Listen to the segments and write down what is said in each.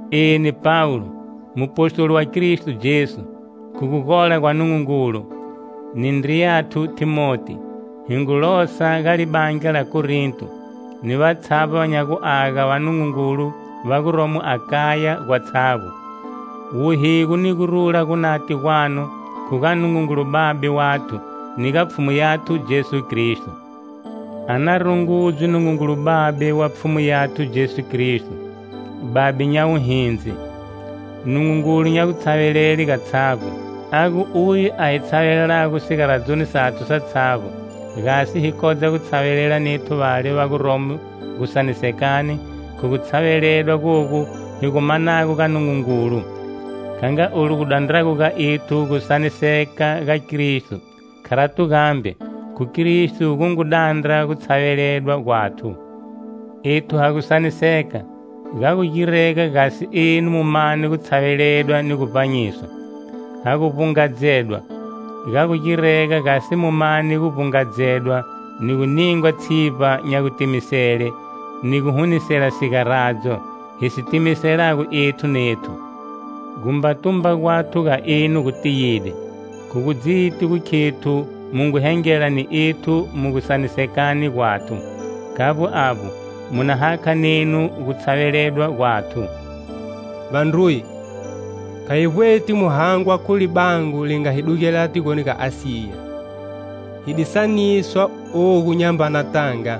Eni, Pawulo, mupostoli wa Kristo Jesu, khu gu gola gwa Nungungulu, ni ndriyathu Thimoti, hi ngu losa ga libandla la Korinto, ni vatshavbo va nya guaga va Nungungulu va guromo Akaya gwatshavbo. Wuhigo ni gurula gunate gwanu khu ga Nungungulu Babe wathu, ni ga Pfhumu yathu Jesu Kristo! A na rungudzwe Nungungulu Babe wa Pfhumu yathu Jesu Kristo, Babe nya wuhindzi, Nungungulu nya gutshavelele gatshavbo, a gu uye a hi tshavelelago sigaradzoni sathu satshavbo gasi hi kodza gu tshavelela nethu vale va guromo gusanisekani khu gu tshaveledwa gogu hi gu manago ga Nungungulu. Kha nga olu gu dandrago ga ethu gusaniseka ga Kristo, kharato gambe, khu Kristo gu ngu dandra gutshaveledwa gwathu. Ethu ha gu saniseka, ga gu girega gasi enu mu mane gu tshaveledwa ni gu vbanyiswa; ha gu vbungadzedwa ga gu girega gasi mu mane guvbungadzedwa ni gu ningwa tshivba nya gutimisele, ni guhunisela sigaradzo, hi si timiselago ethu nethu. Gutumba gwathu ga enu gu tiyide, khu gudziti gu khethu mu ngu hengela ni ethu mu gusanisekani gwathu, khavbo avbo, mu na hakha nenu gu tshaveledwa gwathu. Vandruye, kha hi vbweti mu hangwa khu libango li nga hi dugelela tigoni ga Asiya. Hi di saniswa ogu nyambana tanga,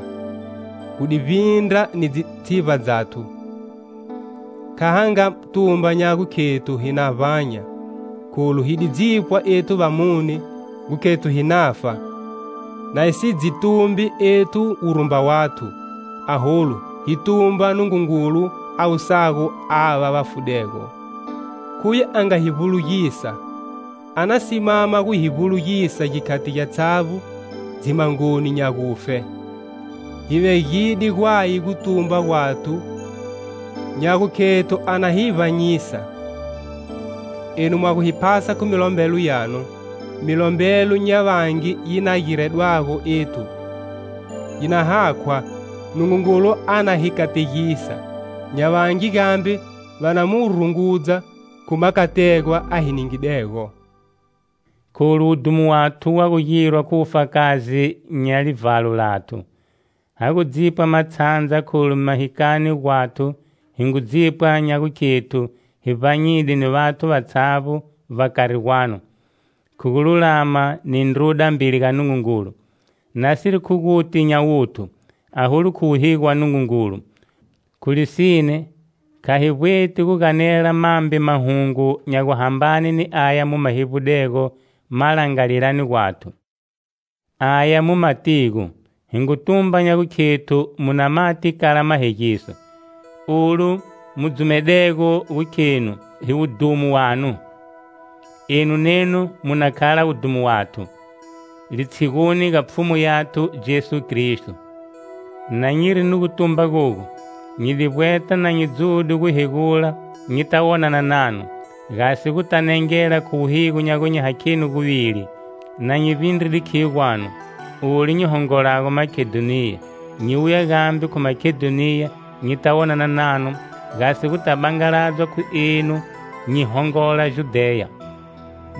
gu di vbindra ni dzitshivba dzathu, kha ha nga tumba nya gukhethu hi na vbanya. Kholu hi di dzipwa ethu vamune gu khethu hi nafa, na hi si dzi tumbi ethu wurumba wathu, aholu hi tumba Nungungulu a wusago ava va fudego. Khuye a nga hi vbulugisa, a na simama gu hi vbulugisa gikhati gyatshavbo dzimhangoni nya gufe: hi vegide Gwaye gutumba gwathu nya gukhethu a na hi vbanyisa. Enu mwa gu hi phasa khu milombelo yanu, milombelo nya vangi yi na giredwago ethu, yi na hakhwa, Nungungulu a na hi kategisa; nya vangi gambe va na mu rungudza khu makategwa a hi ningidego. Kholu wudhumo wathu wa gu girwa khu wufakazi nya livhalo lathu. Ha gu dzipwa matshandza kholu mahikani gwathu hi ngu dzipwa nya gukhethu hi vbanyide ni vathu vatshavbo vbakari gwanu, khu gululama ni ndruda mbeli ga Nungungulu; nasiri khu guti nya wuthu, aholu khu wuhigo wa Nungungulu. Khu lisine, kha hi vbweti guganela mambe mahungu nya guhambane ni aya mu ma hevbulago malangalilani gwathu, aya mu matigo, hi ngu tumba nya gukhethu mu na mati kala mahegiso, olu mu dzumedego gu khenu hi wudhumo wanu, enu nenu mu na khala wudhumo wathu, litshiguni ga Pfhumu yathu Jesu Kristo. Na nyiri ni gutumba gogu, nyi di vbweta na nyi dzude guhegula nyita wonana nanu, gasi guta nengela khu wuhigo nya gu nyi hakheni guvili, na nyi vbindride khiyo gwanu, olu nyi hongolago Makedhoniya, nyi wuya gambe khu Makedhoniya nyita wonana nanu gasi guta bangaladzwa khu enu nyi hongola Judheya.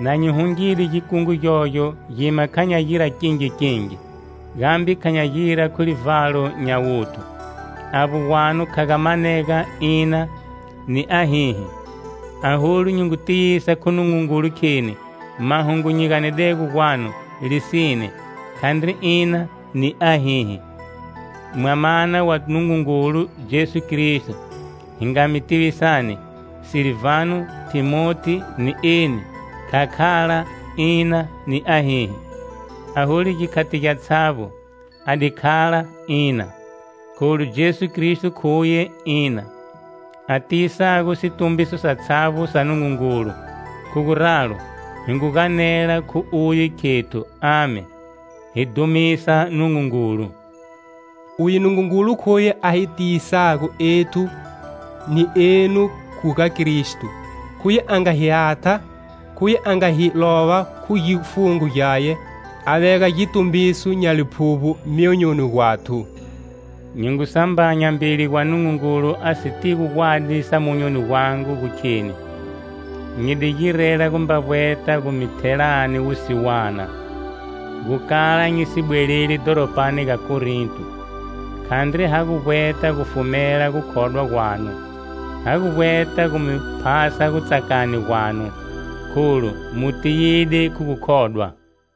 Na nyi hungide gikungu gyogyo gima kha nya gira kingi kingi; gambe kha nya gira khu livhalo nya wuthu. Avbo gwangu kha ga manega "Ina" ni "Ahihi"? Aholu nyi ngu tiyisa khu Nungungulu, kheni mahungu nyi ganedego gwanu lisine, khandri "Ina" ni "Ahihi". Mwamana wa Nungungulu, Jesu Kristo, hi nga mi tivisani, Silvano, Thimoti, ni eni kha khala "Ina ni ahihi," aholu gikhati gyatshavbo a di khala "Ina". Kholu Jesu Kristo khuye "Ina" a tiyisago situmbiso satshavbo sa Nungungulu, khu guralo hi ngu ganela khu Uye khethu "Amen" hi dhumisa Nungungulu. Uye Nungungulu khuye a hi tiyisago ethu ni enu khu ga Kristo, khuye a nga hi hatha; khuye a nga hi lova khu gifungo Gyaye a vega gitumbiso nya Liphuvbo myonyoni gwathu. Nyi ngu sambanya mbeli gwa Nungungulu a sitigo gwadi sa monyoni gwangu gu kheni, nyi di girela gumba vbweta gu mi thelani wusiwana, gu kala nyi si bweleli dhoropani ga Korinto. Khandri ha gu vbweta gu fumela gukhodwa gwanu: ha gu vbweta gu mi phasa gu tsakani gwanu, kholu mu tiyide khu gukhodwa.